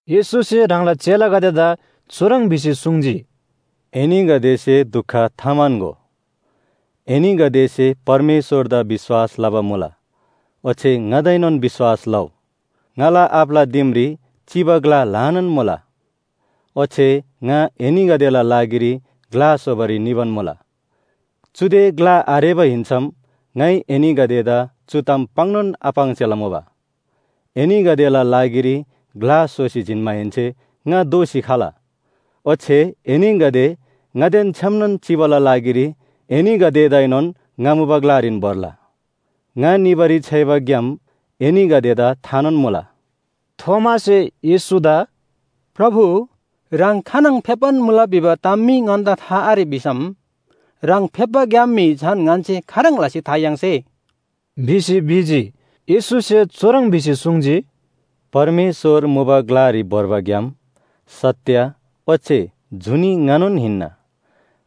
येशूसे ह्राङला चेलागदेदा चुह्रङ् भिसी सुङ्जी, “एनीगदेसे दुख थाम्‍हन्‍गो। एनीगदेसे परमेश्‍वरदा विश्‍वास लबा मुला, ओच्‍छे ङादाएनोन विश्‍वास लउ। ङाला आबाला दिमरी चिबा ग्‍ला ल्‍हानान मुला, ओच्‍छे ङा एनीगदेला लागिरी ग्‍ला स्‍होबारी निबान मुला। चुदे ग्‍ला आरेबा हिन्‍सम ङाइ एनीगदेदा चु ताम पाङ्‌नोन आपाङ्सेला मुबा। एनीगदेला लागिरी ग्‍ला स्‍होसी जिन्‍माहेन्‍से ङा दोःसी खला, ओच्‍छे एनीगदे ङादेन छ्‌यामनोन चिबाला लागिरी एनीगदेदाएनोन ङा मुबा ग्‍लारीन भोर्ला। ङा निबारी छ्‌याइबा ग्‍याम एनीगदेदा थानोन मुला।” थोमासे येशूदा “प्रभु, ह्राङ खानङ फेप्‍बान मुला भिबा ताम मी ङन्‍दा था आरे भिसम ह्राङ फेप्‍बा ग्‍याम मी झन ङन्‍से खाह्रङ् लसी था याङ्से?” भिसी भिजी। येशूसे चुह्रङ् भिसी सुङ्जी, “परमेश्‍वर मुबा ग्‍लारी भोर्बा ग्‍याम, सत्‍य ओच्‍छे जुनी ङानोन हिन्‍ना।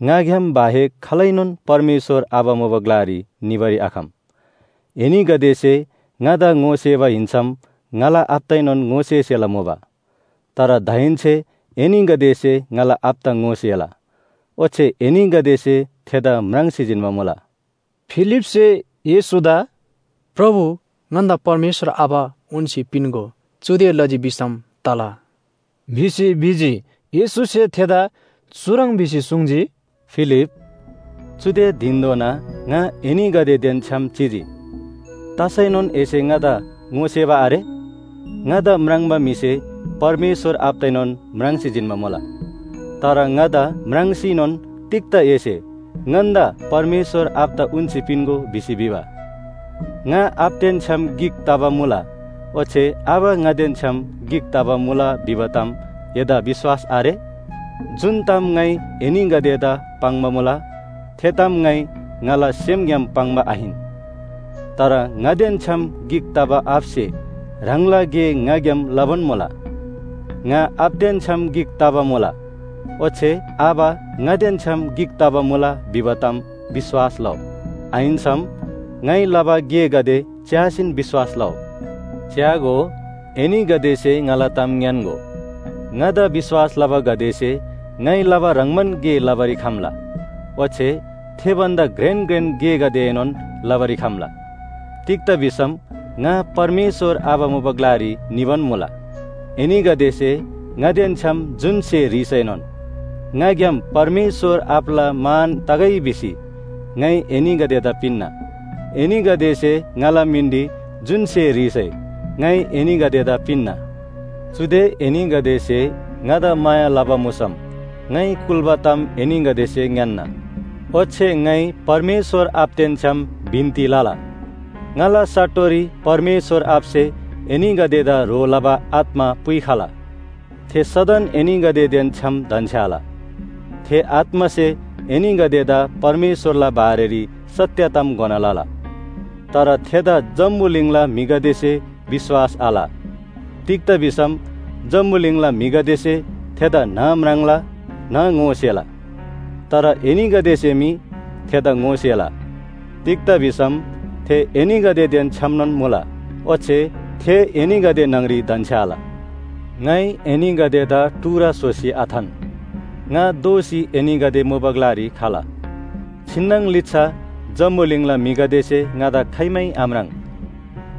ङाग्‍याम बाहेक खालैनोन परमेश्‍वर आबा मुबा ग्‍लारी निबारी आखम। एनीगदेसे ङादा ङोसेबा हिन्‍सम ङाला आबादाएनोन ङोसेसेला मुबा। तर दाहेन्‍से एनीगदेसे ङाला आबादा ङोसेला, ओच्‍छे एनीगदेसे थेदा म्राङ्सी जिन्‍बा मुला। फिलिपसे येशूदा “प्रभु, ङन्‍दा परमेश्‍वर आबा उन्‍सी पिन्‍गो, चुदे लजी भिसम तला” भिसी भिजी। येशूसे थेदा चुह्रङ् भिसी सुङ्जी, “फिलिप, चुदे धिनधोना ङा एनीगदेदेन छ्‌याम चिजी, तसैनोन एसे ङादा ङोसेबा आरे? ङादा म्राङ्बा म्‍हिसे परमेश्‍वर आबादाएनोन म्राङ्सी जिन्‍बा मुला। तर ङादा म्राङ्सीनोन तिग्‍दा एसे ङन्‍दा परमेश्‍वर आबादा उन्‍सी पिन्‍गो भिसी भिबा? ङा आबादेन छ्‌याम गिक तबा मुला ओच्‍छे आबा ङादेन छ्‌याम गिक तबा मुला भिबा ताम एदा विश्‍वास आरे? जुन ताम ङाइ एनीगदेदा पाङ्बा मुला थे ताम ङाइ ङाला सेमग्‍याम पाङ्बा आहिन। तर ङादेन छ्‌याम गिक तबा आबासे ह्राङला गे ङाग्‍याम लबान मुला। ङा आबादेन छ्‌याम गिक तबा मुला ओच्‍छे आबा ङादेन छ्‌याम गिक तबा मुला भिबा ताम विश्‍वास लउ। आहिन्‍सम ङाइ लबा गेगदे च्‍यासीन विश्‍वास लउ। “च्‍यागो, एनीगदेसे ङाला ताम ङ्‌यान्‍गो, ङादा विश्‍वास लबागदेसे ङाइ लबा ह्रङ्‌बान गे लबारी खम्‍ला, ओच्‍छे थे भन्‍दा घ्रेन घ्रेन गेगदेएनोन लबारी खम्‍ला। तिग्‍दा भिसम ङा परमेश्‍वर आबा मुबा ग्‍लारी निबान मुला। एनीगदेसे ङादेन छ्‌याम जुन स्‍हे ह्रीसैनोन ङाग्‍याम परमेश्‍वर आबाला मान तगै भिसी ङाइ एनीगदेदा पिन्‍ना। एनीगदेसे ङाला मिनरी जुन स्‍हे ह्रीसै ङाइ एनीगदेदा पिन्‍ना। “चुदे एनीगदेसे ङादा माया लबा मुसम ङाइ कुल्‍बा ताम एनीगदेसे ङ्‌यान्‍ना। ओच्‍छे ङाइ परमेश्‍वर आबादेन छ्‌याम बिन्‍ती लला, ङाला साटोरी परमेश्‍वर आबासे एनीगदेदा ह्रो लबा आत्‍मा पुइखला। थे सदन एनीगदेदेन छ्‌याम धन्‍छ्‌याला। थे आत्‍मासे एनीगदेदा परमेश्‍वरला बारेरी सत्‍य ताम घोना लला। तर थेदा जम्‍बुलिङला म्‍हिगदेसे विश्‍वास आल, तिग्‍दा भिसम जम्‍बुलिङला म्‍हिगदेसे थेदा न्‍ह म्राङ्ला न्‍ह ङोसेला। तर एनीगदेसे मी थेदा ङोसेला, तिग्‍दा भिसम थे एनीगदेदेन छ्‌यामनोन मुला ओच्‍छे थे एनीगदे न्‍हङ‍री धन्‍छ्‌याला। “ङाइ एनीगदेदा टुहुरा स्‍होसी आथान, ङा दोःसी एनीगदे मुबा ग्‍लारी खला। छिन्‍नङ लिच्‍छा जम्‍बुलिङला म्‍हिगदेसे ङादा खाइमै आम्राङ्,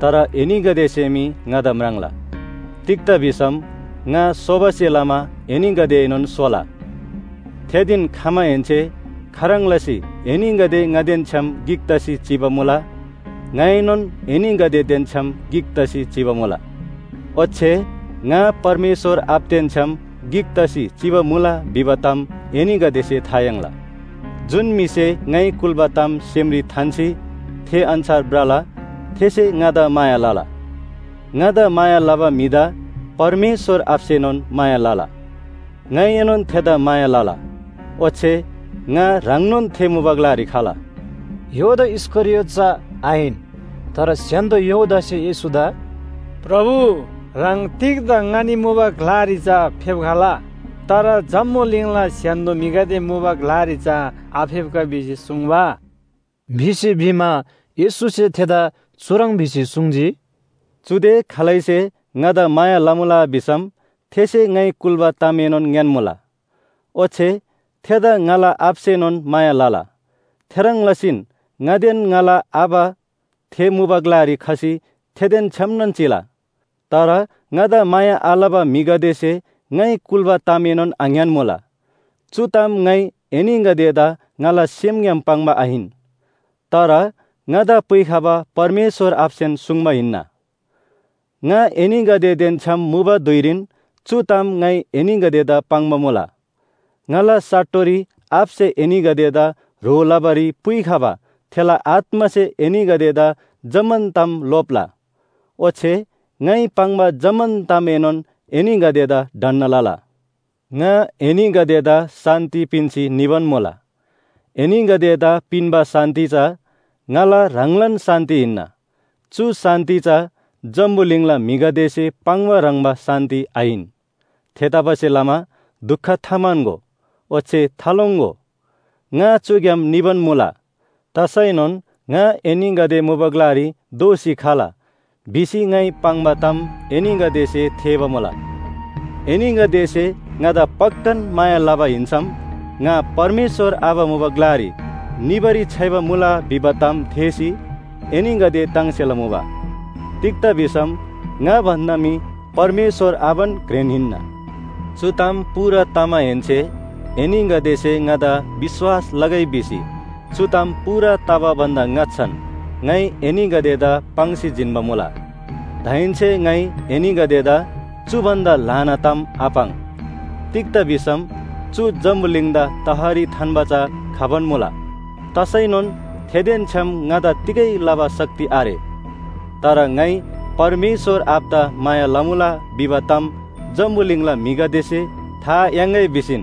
तर एनीगदेसे मी ङादा म्राङ्ला। तिग्‍दा भिसम ङा सोबासे लमा एनीगदेएनोन सोला। थे धिन खमाहेन्‍से खाह्रङ् लसी एनीगदे ङादेन छ्‌याम गिक तसी चिबा मुला, ङाएनोन एनीगदेदेन छ्‌याम गिक तसी चिबा मुला, ओच्‍छे ङा परमेश्‍वर आबादेन छ्‌याम गिक तसी चिबा मुला भिबा ताम एनीगदेसे था याङ्ला। जुन म्‍हिसे ङाइ कुल्‍बा ताम सेमरी थान्‍सी थे अन्‍छार भ्रला थेसे ङादा माया लला। ङादा माया लबा म्‍हिदा परमेश्‍वर आबासेनोन माया लला, ङाइएनोन थेदा माया लला ओच्‍छे ङा ह्राङनोन थे मुबा ग्‍लारी खला।” यहूदा इस्‍करियोत चा आहिन, तर स्‍य्‍हान्‍दो यहूदासे येशूदा “प्रभु, ह्राङ तिग्‍दा ङनी मुबा ग्‍लारी चा फेप्‍खला, तर जम्‍बुलिङला स्‍य्‍हान्‍दो म्‍हिगदे मुबा ग्‍लारी चा आफेप्‍ख भिसी सुङ्बा?” भिसी भिमा, येशूसे थेदा चुह्रङ् भिसी सुङ्जी, “चुदे खालैसे ङादा माया लमुला भिसम थेसे ङाइ कुल्‍बा तामएनोन ङ्‍यान्‍मुला। ओच्‍छे थेदा ङाला आबासेनोन माया लला, थेह्रङ् लसीन ङादेन ङाला आबा थे मुबा ग्‍लारी खसी थेदेन छ्‌यामनोन चिला। तर ङादा माया आलबा म्‍हिगदेसे ङाइ कुल्‍बा तामएनोन आङ्‌यान्‍मुला। चु ताम ङाइ एनीगदेदा ङाला सेमग्‍याम पाङ्बा आहिन, तर ङादा पुइखबा परमेश्‍वर आबासेन सुङ्बा हिन्‍ना। “ङा एनीगदेदेन छ्‌याम मुबा धुइरीन चु ताम ङाइ एनीगदेदा पाङ्बा मुला। ङाला साटोरी आबासे एनीगदेदा ह्रो लबारी पुइखबा थेला आत्‍मासे एनीगदेदा जम्‍मान ताम लोप्‍ला ओच्‍छे ङाइ पाङ्बा जम्‍मान तामएनोन एनीगदेदा ढन्‍ना लला। “ङा एनीगदेदा शान्‍ति पिन्‍सी निबान मुला। एनीगदेदा पिन्‍बा शान्‍ति चा ङाला ह्राङलान शान्‍ति हिन्‍ना। चु शान्‍ति चा जम्‍बुलिङला म्‍हिगदेसे पाङ्बा ह्रङ्‌बा शान्‍ति आहिन। थेतबासेलमा दुख थाम्‍हन्‍गो ओच्‍छे थालोङ्‍गो। “‘ङा चुग्‍याम निबान मुला, तसैनोन ङा एनीगदे मुबा ग्‍लारी दोःसी खला’ भिसी ङाइ पाङ्बा ताम एनीगदेसे थेःबा मुला। एनीगदेसे ङादा पक्‍कान माया लबा हिन्‍सम ङा परमेश्‍वर आबा मुबा ग्‍लारी निबारी छ्‌याइबा मुला भिबा ताम थेःसी एनीगदे ताङ्सेला मुबा। तिग्‍दा भिसम ङा भन्‍दा मी परमेश्‍वर आबान घ्रेन हिन्‍ना। चु ताम पूरा तमाहेन्‍से एनीगदेसे ङादा विश्‍वास लगै भिसी चु ताम पूरा तबा भन्‍दा ङाच्‍छान ङाइ एनीगदेदा पाङ्सी जिन्‍बा मुला। दाहेन्‍से ङाइ एनीगदेदा चु भन्‍दा ल्‍हाना ताम आपाङ्। तिग्‍दा भिसम चु जम्‍बुलिङदा तहरी थान्‍बा चा खबान मुला। तसैनोन थेदेन छ्‌याम ङादा तिगै लबा शक्ति आरे। तर ङाइ परमेश्‍वर आबादा माया लमुला भिबा ताम जम्‍बुलिङला म्‍हिगदेसे था याङ्‌गै भिसीन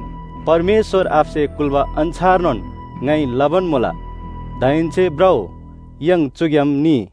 परमेश्‍वर आबासे कुल्‍बा अन्‍छारनोन ङाइ लबान मुला। दाहेन्‍से भ्रउ, य्‍हाङ चुग्‍याम निइ।